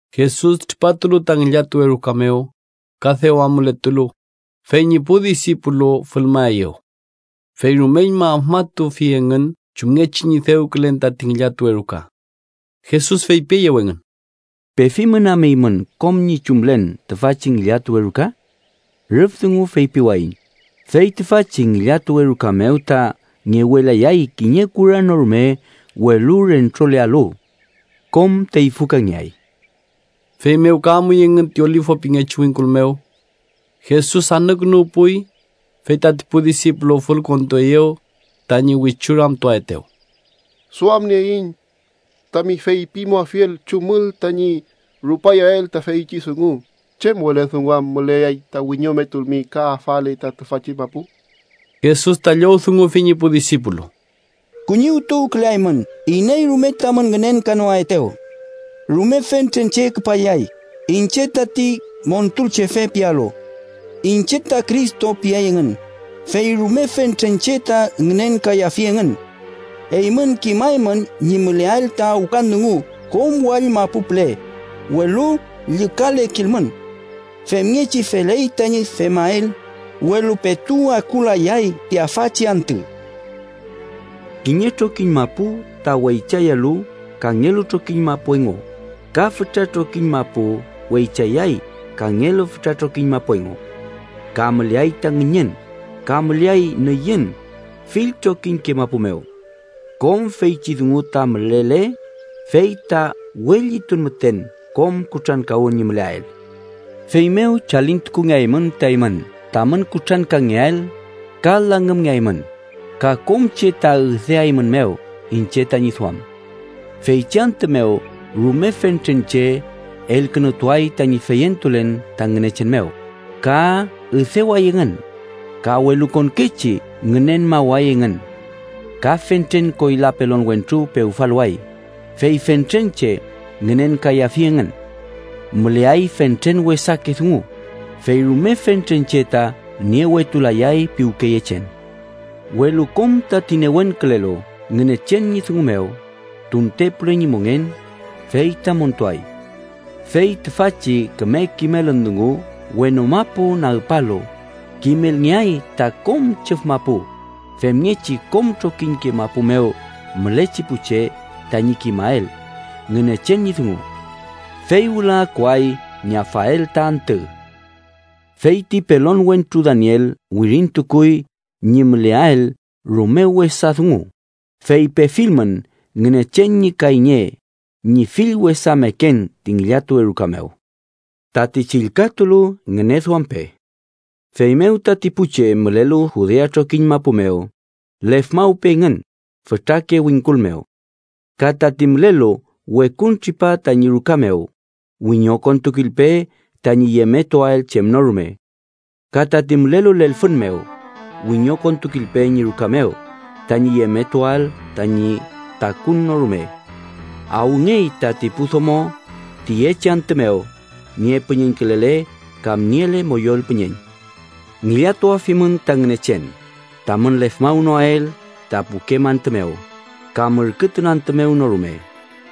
Jesus tripatulu ta ngillatuwe ruka mew, ka dew amuletulu, fey ñi pu disipulu fülmaeyew. Fey rumeñma afmatufi engün chumngechi ñi dewkülen tati ngillatuwe ruka. Jesus feypieyew engün: —¿Pefimün am eymün kom ñi chumlen tüfachi ngillatuwe ruka? Rüf dungu feypiwayiñ, fey tüfachi ngillatuwe ruka mew ta ngewelayay kiñe kura no rume welu rentrolealu. Kom teyfükangeay. Feymew ka amuy engün ti Olifu pingechi wingkul mew. Jesus anükünuwpuy, fey tati pu disipulu fülkontueyew tañi wichu ramtuaetew: —Duamnieiñ tami feypimuafiel chumül tañi rupayael ta feychi dungu. ¿Chem wele dungu am müleay ta wiñometualmi ka afale ta tüfachi mapu? Jesus ta llowdungufi ñi pu disipulu: —Kuñiwtuwküleaymün iney rume tamün ngünenkanoaetew. Rume fentren che küpayay ‘iñche tati Montulchefe’ pialu. ‘Iñche ta Cristo’ piay engün, fey rume fentren che ta ngünenkayafi engün. Eymün kimaymün ñi müleael ta awkan dungu kom wall mapu püle, welu llükalekilmün. Femngechi feley tañi femael, welu petu akulayay ti afachi antü. “Kiñe trokiñ mapu ta weychayalu kangelu trokiñ mapu engu ka fütra trokiñ mapu weychayay kangelu fütra trokiñ mapu engu. Ka müleay ta ngüñün, ka müleay nüyün fill trokiñke mapu mew. Kom feychi dungu ta mülele, fey ta we llitun müten kom kutrankawün ñi müleael. “Feymew chalintukungeaymün ta eymün tamün kutrankangeael, ka langümngeaymün, ka kom che ta üdeaeymünmew iñche tañi duam. Feychi antü mew rume fentren che elkünutuay tañi feyentulen ta Ngünechen mew, ka üdeway engün ka welukonkechi ngünenmaway engün. Ka fentren koyla pelon wentru pewfaluway, fey fentren che ngünenkayafi engün. Müleay fentren wesake dungu, fey rume fentren che ta niewetulayay piwkeyechen. Welu kom tati newenkülelu Ngünechen ñi dungu mew tuntepule ñi mongen, fey ta montuay. Fey tüfachi küme kimelün dungu wenu mapu nagpalu kimelngeay ta kom chüf mapu, femngechi kom trokiñke mapu mew mülechi pu che tañi kimael Ngünechen ñi dungu. Fey wüla akuay ñi afael ta antü. “Fey ti pelon wentru Daniel wirintukuy ñi müleael rume wesa dungu, fey pefilmün Ngünechen ñi kayñe ñi fill wesa meken ti ngillatuwe ruka mew ―tati chillkatulu, ngüneduampe―, feymew tati pu che mülelu Judea trokiñ mapu mew, lefmawpe engün fütrake wingkul mew. Ka tati mülelu wekuntripa tañi ruka mew, wiñokontukilpe tañi yemetuael chem no rume. Ka tati mülelu lelfün mew, wiñokontukilpe ñi ruka mew tañi yemetuael tañi takun no rume. ¡Awngey tati pu domo tiyechi antü mew niepüñeñkülele kam niele moyol püñeñ! Ngillatuafimün ta Ngünechen tamün lefmawnoael ta pukem antü mew kam ürkütun antü mew no rume,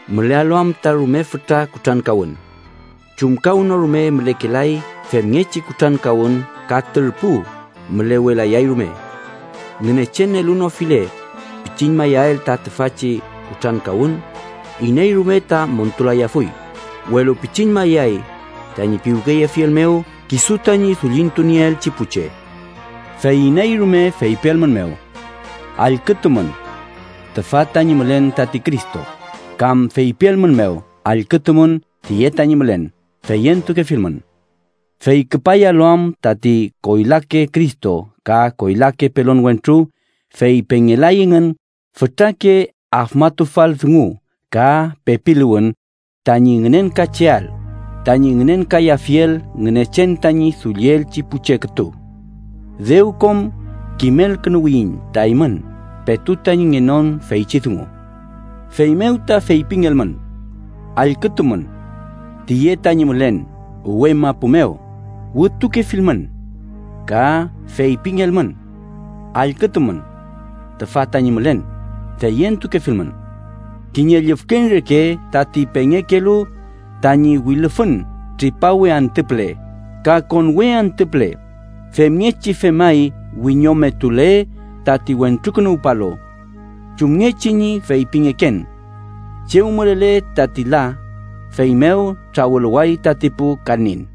mülealu am ta rume fütra kutrankawün. Chumkawnorume mülekelay femngechi kutrankawün ka turpu mülewelayay rume. Ngünechen elunofile pichiñmayael ta tüfachi kutrankawün, iney rume ta montulayafuy, welu pichiñmayay tañi piwkeyefiel mew kisu tañi dullintunieelchi pu che. “Fey iney rume feypielmünmew: ‘Allkütumün. Tüfa tañi mülen tati Cristo’, kam feypielmünmew: ‘Allkütumün. Tiye tañi mülen’, feyentukefilmün. Fey küpayalu am tati koylake Cristo ka koyla pelonke wentru, fey pengelay engün fütrake afmatufal dungu ka pepiluwün tañi ngünenkacheael, tañi ngünenkayafiel Ngünechen tañi dullielchi pu che kütu. Dew kom kimelkünuwiyiñ ta eymün petu tañi ngenon feychi dungu. “Feymew ta feypingelmün: ‘Allkütumün. Tiye tañi mülen uwe mapu mew’, wütukefilmün. Ka feypingelmün: ‘Allkütumün. Tüfa tañi mülen’, feyentukefilmün. Kiñe llüfkeñ reke tati pengekelu tañi wilüfün tripawe antü püle kam konwe antü püle, femngechi femay wiñometule tati Wentrukünuwpalu. Chumngechi ñi feypingeken: Chew mülele tati la, fey mew trawüluway tati pu kanin.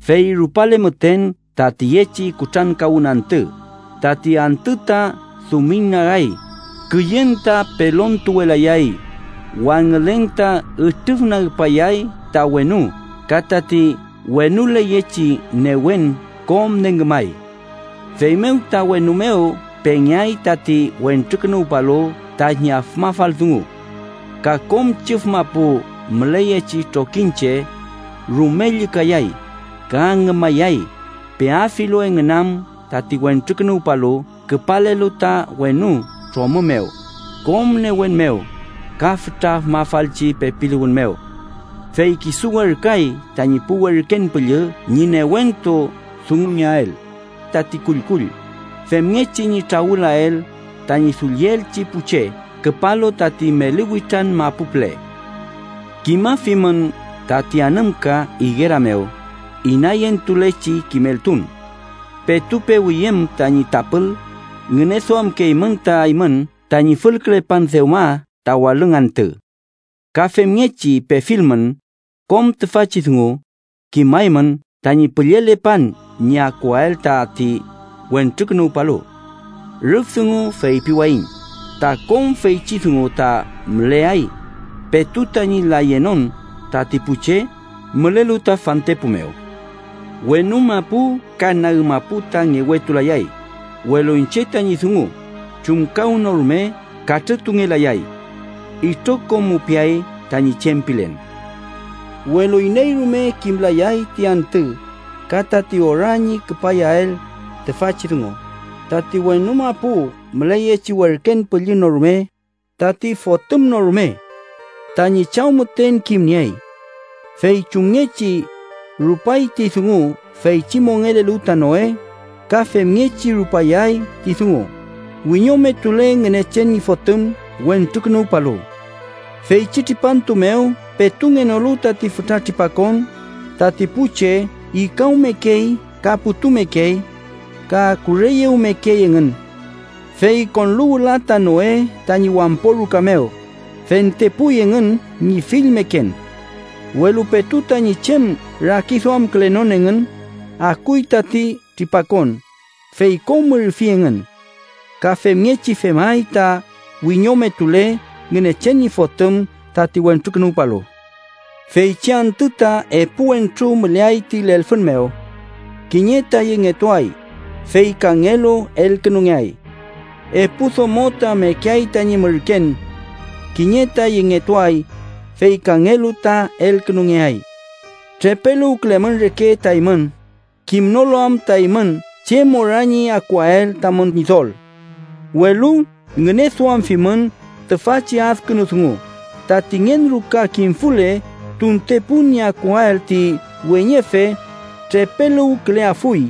“Fey rupale müten ta tiyechi kutrankawün antü, ‘tati antü ta dumiñnagay, küyen ta pelontuwelayay, wangülen ta ütrüfnagpayay ta wenu ka tati wenuleyechi newen kom nengümay.’ “Feymew ta wenu mew pengeay tati Wentrukünuwpalu tañi afmafal dungu. Ka kom chüf mapu müleyechi trokiñche rume llükayay ka ngümayay, peafilu engün am tati Wentrukünuwpalu küpalelu ta wenu tromü mew kom newen mew ka fütra afmatufalchi pepiluwün mew. Fey kisu werküay tañi pu werken püllü ñi newentu dungulngeael tati kullkull, femngechi ñi trawüluwael tañi dullielchi pu che küpalu tati meli witran mapu püle. “Kimafimün tati anümka igera mew inayentulechi kimeltun: petu pewüyüm tañi tapül, ngüneduamkeymün ta eymün tañi fülkülepan dewma ta walüng antü. Ka femngechi, pefilmün kom tüfachi dungu, kimaymün tañi püllelepan ñi akuael tati Wentrukünuwpalu. Rüf dungu feypiwayiñ ta kom feychi dungu ta müleay petu tañi layenon tati pu che mülelu ta fantepu mew. Wenu mapu ka nag mapu ta ngewetulayay, welu iñche tañi dungu chumkawnorume katrütungelayay. Itrokom mupiay tañi chem pilen. “Welu iney rume kimlay ti antü ka tati ora ñi rupayael tüfachi dungu, tati wenu mapu müleyechi werken püllü no rume, tati Fotüm no rume. Tañi Chaw müten ta kimniey. Fey chumngechi rupay ti dungu feychi mongelelu ta Noe, ka femngechi rupayay ti dungu wiñometule Ngünechen ñi Fotüm Wentrukünuwpalu. Feychi tripantu mew petu ngenolu tati fütra tripakon, tati pu che ikawmekey ka putumekey ka kureyewmekey engün. Fey konlu wüla ta Noe tañi wampo ruka mew, fentepuy engün ñi fill meken. Welu petu tañi chem rakiduamkülenon engün, akuy tati tripakon, fey kom ürfi engün. Ka femngechi femay ta wiñometule Ngünechen ñi Fotüm tati Wentrukünuwpalu. Feychi antü ta epu wentru müleay ta lelfün mew. Kiñe ta yengetuay, fey kangelu elkünungeay. Epu domo ta mekeay tañi mürken. Kiñe ta yengetuay, fey kangelu ta elkünungeay. “Trepeluwkülemün reke ta eymün, kimnolu am ta eymün chem ora ñi akuael tamün Ñidol. Welu ngüneduamfimün tüfachi adkünu dungu: tati ngen ruka kimfule tuntepun ñi akuael ti weñefe, trepeluwküleafuy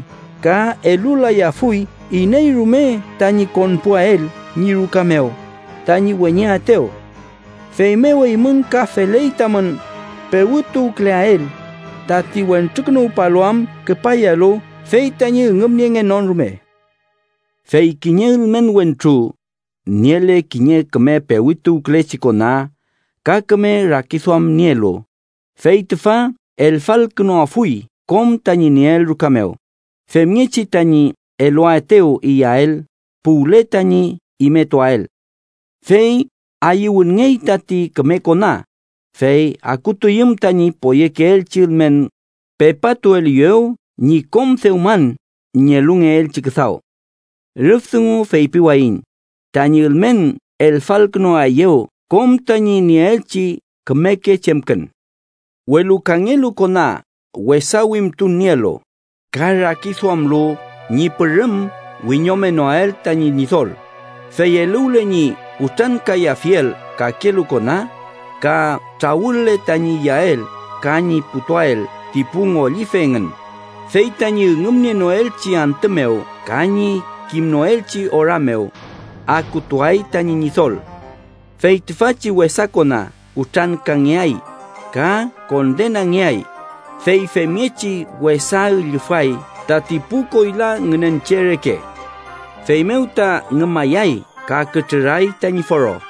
ka elulayafuy iney rume tañi konpuael ñi ruka mew tañi weñeaetew. Feymew, eymün ka feley tamün pewütuwküleael, tati Wentrukünuwpalu am küpayalu fey tañi üngümniengenon rume. “Fey kiñe ülmen wentru niele kiñe küme pewütuwkülechi kona ka küme rakiduam nielu, fey tüfa elfalkünuafuy kom tañi nieel ruka mew, femngechi tañi eluaetew iyael puwle tañi imetuael. Fey ayüwünngey tati küme kona, fey akutuyüm tañi poyekeelchi ülmen, pepatueliyew ñi kom dewman ñi elulngeelchi küdaw. Rüf dungu feypiwayiñ tañi ülmen elfalkünuaeyew kom tañi nieelchi kümeke chemkün. “Welu kangelu kona wesa wimtun nielu, ka rakiduamlu ñi pürüm wiñomenoael tañi ñidol, fey eluwle ñi kutrankayafiel kakelu kona, ka trawüle tañi iyael ka ñi putuael ti pu ngollife engün, fey tañi üngümnienoelchi antü mew ka ñi kimnoelchi ora mew, akutuay tañi ñidol. Fey tüfachi wesa kona kutrankangeay, ka kondenangeay, fey femngechi wesa üllüfay tati pu koyla ngünen che reke. Feymew ta ngümayay ka kütrüray tañi foro.